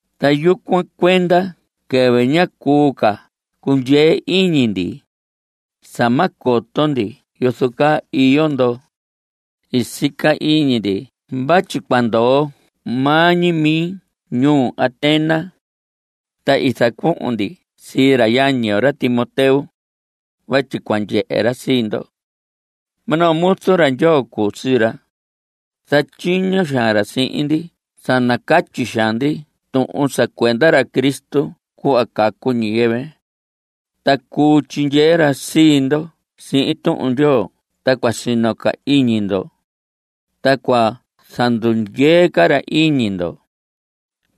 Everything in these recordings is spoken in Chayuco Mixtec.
Ta yucuan cuenda quɨvɨ ñá cuu ca cundyee iñi ndi (sa ma coto ndi yozo caa iyo ndo) i sica iñi ndi vatyi cua ndoo maa ñi mi ñuu Atenas. Ta i zacuhun ndi sii ra yañi yo, ra Timoteo, vatyi cua ndyehe ra sii ndo. Minoo muzu ra Ndyoo cuu sii ra. Zatyiño xaan ra sihin ndi sa nacatyi xaan ndi tuhun sa cuenda ra Cristo cuhva cacu ñiyɨvɨ. Ta cuu tyindyee ra sii ndo sihin Tuhun Ndyoo ta cua sino ca iñi ndo, ta cua zandundyee ca ra iñi ndo.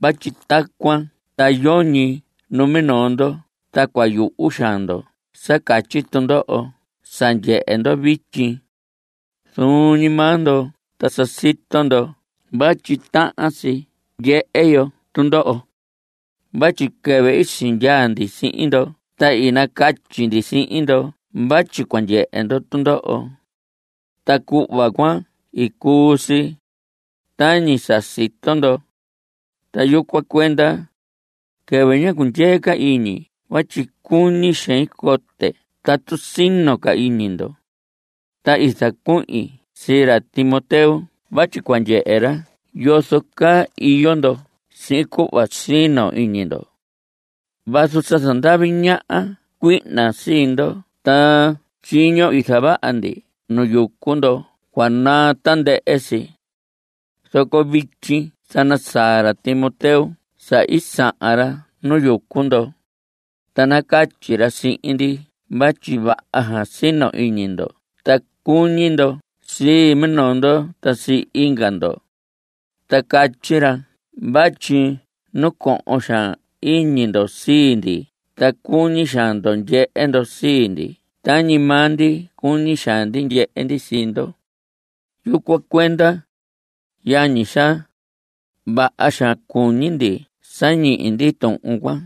Vatyi tacuan ta yoñi numinoo ndo ta cua yuhu xaan ndo sa catyi tundoho sa ndyehe ndo vityi. Zuun ñi maa ndo ta sa sito ndo vatyi tahan si ndyehe yo tundoho. Vatyi quɨvɨ i sindyaa ndi sihin ndo ta i nacatyi ndi sihin ndo vatyi cua ndyehe yo tundoho. Ta cuhva cuan i cuu si, tañi sa sito ndo. Ta yucuan cuenda, quɨvɨ ñá cundyee ca iñi vatyi cuñi xein cote tatu sino ca iñi ndo, ta i zacuhin sii ra Timoteo vatyi cua ndyehe ra yozo caa iyo ndo sihin cuhva sino iñi ndo. Vazu sa zandavi ñaha cuihna sii ndo ta tyiño i zavaha ndi nu yucu ndo cua naa tandɨhɨ si. Zoco vityi sa nasaa ra Timoteo sa i sahan ra nu yucu ndo, ta nacatyi ra sihin ndi vatyi vaha xaan sino iñi ndo ta cuñi ndo sii minoo ndo ta sii inga ndo. Ta catyi ra vatyi nacohon xaan iñi ndo sii ndi ta cuñi xaan ndo ndyehe ndo sii ndi tañi maa ndi cuñi xaan ndi ndyehe ndi sii ndo. Yucuan cuenda, yañi xaa, vaha xaan cuñi ndi sa ñihi ndi tuhun cuan.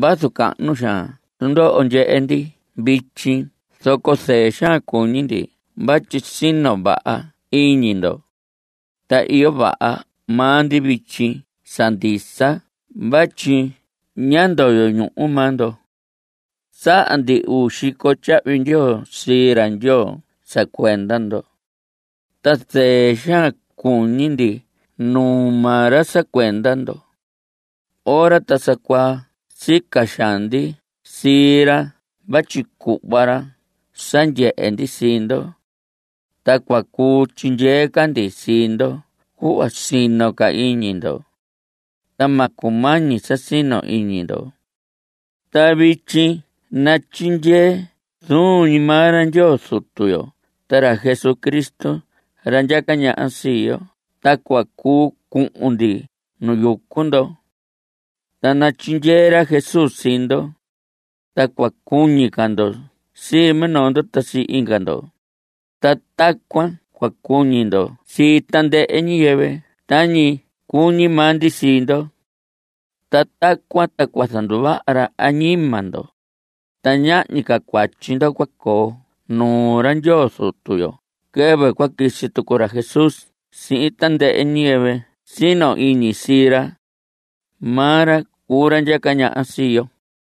Vazu cahnu xaan tundoho ndyehe ndi vityi zoco zɨɨ xaan cuñi ndi vatyi sino vaha iñi ndo. Ta iyo vaha maa ndi vityi sa ndisa vatyi ñá ndoyo ñuhu maa ndo. Saha ndi uu xico tyahvi ndyoo sii ra Ndyoo sa cuenda ndo, ta zɨɨ xaan cuñi ndi nuu maa ra sa cuenda ndo. Ora ta sa cuaa sica xaan ndi sii ra vatyi cuhva ra sa ndyehe ndi sii ndo, ta cua cuu tyindyee ca ndi sii ndo cuhva sino ca iñi ndo, ta ma cumañi sa sino iñi ndo. Ta vityi natyindyee zuun ñi maa ra Ndyoo Zutu yo ta ra Jesucristo ra ndyaca ñaha sii yo ta cua cuu cuhun ndi nu yucu ndo. Ta natyindyee ra Jesús sii ndo, ta cua cuñi ca ndo sii minoo ndo ta sii inga ndo, ta tacuan cua cuñi ndo sii tandɨhɨ ñiyɨvɨ tañi cuñi maa ndi sii ndo. Ta tacuan ta cua zanduvaha ra añima ndo, ta ñahñi ca cuatyi ndo cua coo nuu ra Ndyoo Zutu yo quɨvɨ cua quisi tucu ra Jesús sihin tandɨhɨ ñiyɨvɨ sino iñi sii ra. Maa ra cuu ra ndyaca ñaha sii yo.